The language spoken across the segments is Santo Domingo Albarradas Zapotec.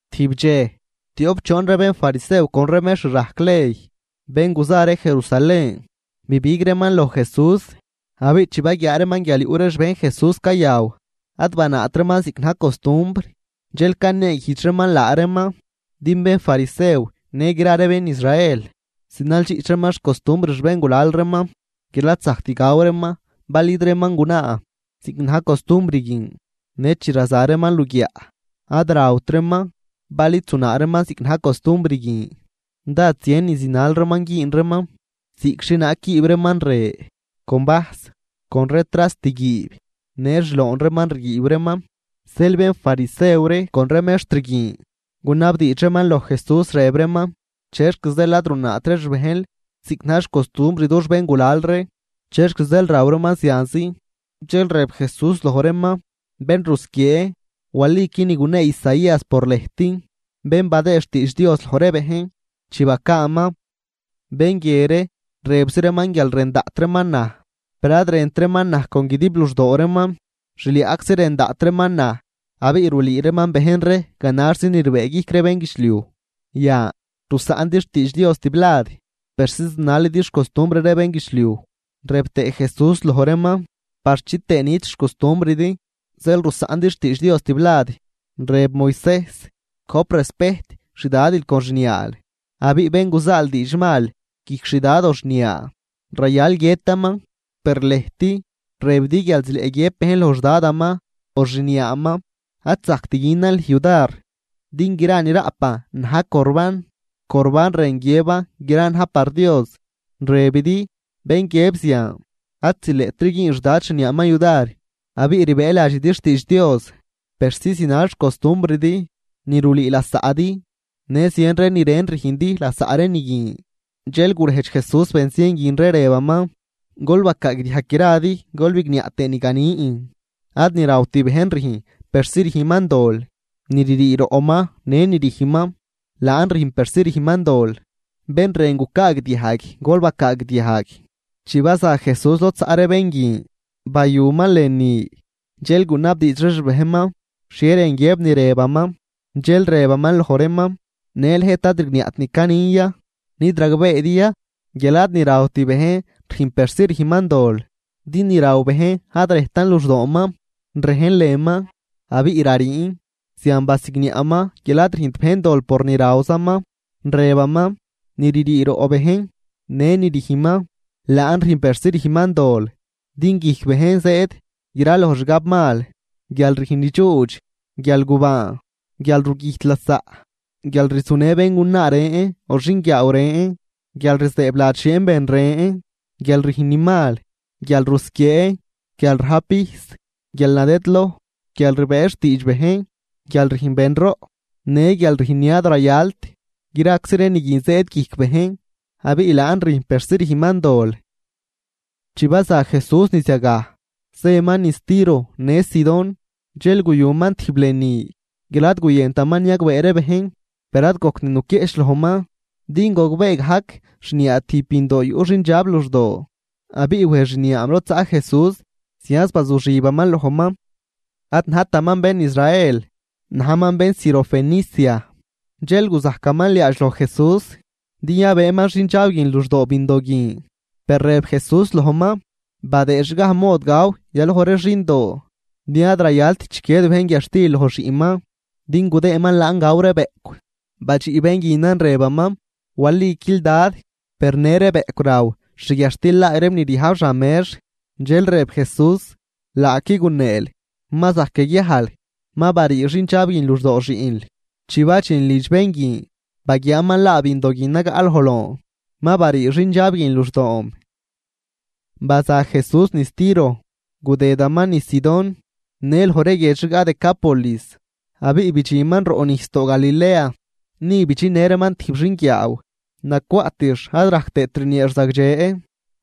Tijb dxej, tioꞌp choon ree bénfarisew con ree mextr rajc ley, bén guza ree Jerusalén, bibig reeman loj Jesús. Abiꞌ chi baguiaa reeman guial yuꞌ ree xbejn Jesús cayaw, ad banaat reeman ziꞌc na̱j costumbr. Dxel caneeguijdx reeman laa reeman. (Din bénfarisew në gra ree bén Israel zinaldxiꞌch reeman xcostumbr xbéngulal reeman guial ad zajct gaw reeman bal id reeman gunaa ziꞌc na̱j costumbr guin. Në chi raza reeman luguiaꞌ, ad rawt reeman bal id zunaa reeman ziꞌc na̱j costumbr guin. Dád zien ni zinal reeman güün reeman ziꞌc xhienaag quiib reeman re, con vajs, con ree trast guiib, në xloon reeman riguiib reeman.) Zeel bénfarisew ree con ree mextr guin, gunabdiidx reeman loj Jesús, rëb reeman: ―¿Chexc zeel ad runaat ree xbejnl ziꞌc na̱j xcostumbr dux béngulal ree? ¿Chexc zeel raw reeman zianzi? Dxel rëb Jesús loj reeman: ―¡Bén rusquiee!, waliqui ni gunee Isaías por lëjt, bén badëë xtiidx Dios loj ree bejn, chi bacaaman: Bén guie ree, rëbzi reeman guial rën daꞌt reeman naj, per ad rënt reeman naj con guidib luxdoo reeman. Xliaꞌczi rën daꞌt reeman naj, abiꞌ rulüü reeman bejn ree ganaxzi ni rbëëguijc ree bénguidxliuj. Yan, rusaꞌndi xtiidx Dios tiblad persi zinalidi xcostumbr ree bénguidxliuj. Rëb tëë Jesús loj reeman: ―Par chitëë nit xcostumbridi zeel rusaꞌndi xtiidx Dios tiblad. Rëb Moisejs: “Gojp respejt xdadil con xniaal”, abiꞌ “Bén guzaal diidxmal guijc xdad o xniaa, rayal guiëtaman.” Per lëjt rëbidi guial zileꞌ guiëb bejn loj xDadaman o xniaaman: “Ad zajct günan lüj yudar, din gra ni raꞌpan na̱j Corbán” (Corbán rën guiëb gran na̱j par Dios). Rëbidi, bén guiëb zian, ad zileꞌtri güün xdad xniaaman yudar. Abiꞌ rbëëladxidi xtiidx Dios persi zinal xcostumbridi ni rulüü lasaꞌdi, në zien ree ni ren rüjndi lasaꞌ ree ni guin. Dxel gurejdx Jesús bén zien guin ree, rëbaman: ―Gol bacaagdiajg gradi gol bigniaꞌ tëë ni ganin: Ad ni rawt bejn rüjn persi rüjnman dol. Ni ririi roꞌman në ni rüjnman, laan rüjn persi rüjnman dol. ¡Bén rën gucaagdiajg, gol bacaagdiajg! Chi baza Jesús lod zaꞌ ree bén guin bayuman lënü, dxel gunabdiidx ree xbejnman xhie rën guiëb ni rëbaman. Dxel rëbaman loj reeman: ―¿Në lëjt ad rigniaꞌt ni canin ya? ¿Nid ragbeedi ya guial ad ni rawt bejn rüjn persi rüjnman dol, din ni raw bejn ad rejtan luxdooman, rejn lënman, abiꞌ rariin? Zian basigniaꞌman guial ad rüjnt bejn dol por ni rawzaman. Rëbaman: ―Ni ririi roꞌ bejn në ni rüjnman, laan rüjn persi rüjnman dol. Din guijc bejn zëëd graloj xgab mal, guial rüjn ni dxuudx, guialgubaan, guialrugüjt lasaꞌ, guial rzunë béngunaa ren o xinguiaaw ren, guialrzëëbladx xieen ben ren, guial rüjn ni mal, guialrusquiee, guialrajp vijs, guialnadëdloj, guialrbëë xtiidx bejn, guialrüjn benroꞌ, në guial rüjn ni ad rayalt. Graczi ree ni guin zëëd guijc bejn, abiꞌ laan rüjn persi rüjnman dol. Chi baza Jesús niz yagaj, zëman niz Tiro në Sidón. Dxel guyuman tijb lënü guial ad guyëntaman niagbee ree bejn, per ad gojct nuquieꞌch lojman. Din gogbee gajc xniaa tijb bindoo yuꞌ xindxab luxdoo. Abiꞌ wej xniaam lod zaꞌ Jesús zianz bazuxibaman lojman. Ad najtaman bén Israel, najman bén Sirofenicia. Dxel guzajcaman liaadx loj Jesús din yabëëman xindxab guin luxdoo bindoo guin. Per rëb Jesús lojman: ―Badëëdxgaj mod gaw yaloj ree xindoo, din ad rayalt chiquied bejn guiadxtil loj xiꞌnman din gudëëman laan gaw ree bëꞌcw. Badxiꞌ bén guinan rëbaman: ―Waliquil, Dad, per në ree bëꞌcw raw xguiadxtil laay reem ni ryajb xan mex. Dxel rëb Jesús: ―Laaqui guneel. Ma zajc yaguiajl, ma barii xindxab guin luxdoo xiꞌnl. Chi badxin lidx bén guin, baguiaaman laa bindo guin nagaꞌ loj loon, ma barii xindxab guin luxdoom. Baza Jesús niz Tiro, gudëdaman niz Sidón, në loj ree guiedx rigaꞌ Decápolis abiꞌ bidxinman roꞌnijsdoo Galilea. Ni bidxinnë reeman tijb xinguiaaw nacwaꞌtix ad rajc tëët rnieex zagdxe.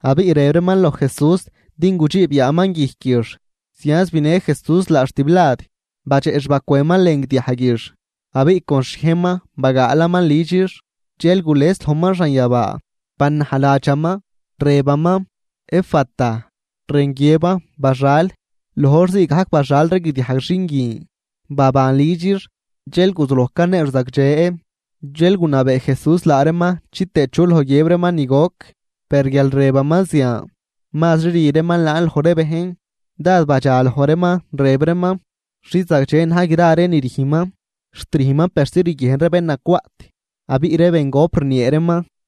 Abiꞌ rëb reeman loj Jesús din gudxiib yaaman guijquix. Zianz binë Jesús laax tiblad, badxeꞌ xbacwënman lën guidiajguix, abiꞌ con xhiejnman bagaalaman lüdxix. Dxel gules lojman xanyabaa, banajladxaman, rëbaman: ―¡Efata! ―rën guiëban: ¡Baxal! Loj hor zii gajc baxal ree guidiajg xin guin, baban lüdxix dxel guzuloj caneex zagdxe. Dxel gunabee Jesús laa reeman chitëë chu loj guiëb reeman ni goc. Per guial rëbaman zian, mazri rü reeman laan loj ree bejn. Dád badxa loj reeman rëb reeman: ―Xi zagdxe na̱j gra ree ni rüjnman, xt rüjnman persi riguiejn ree bén nacwaꞌt, abiꞌ ree bengop rniee reeman.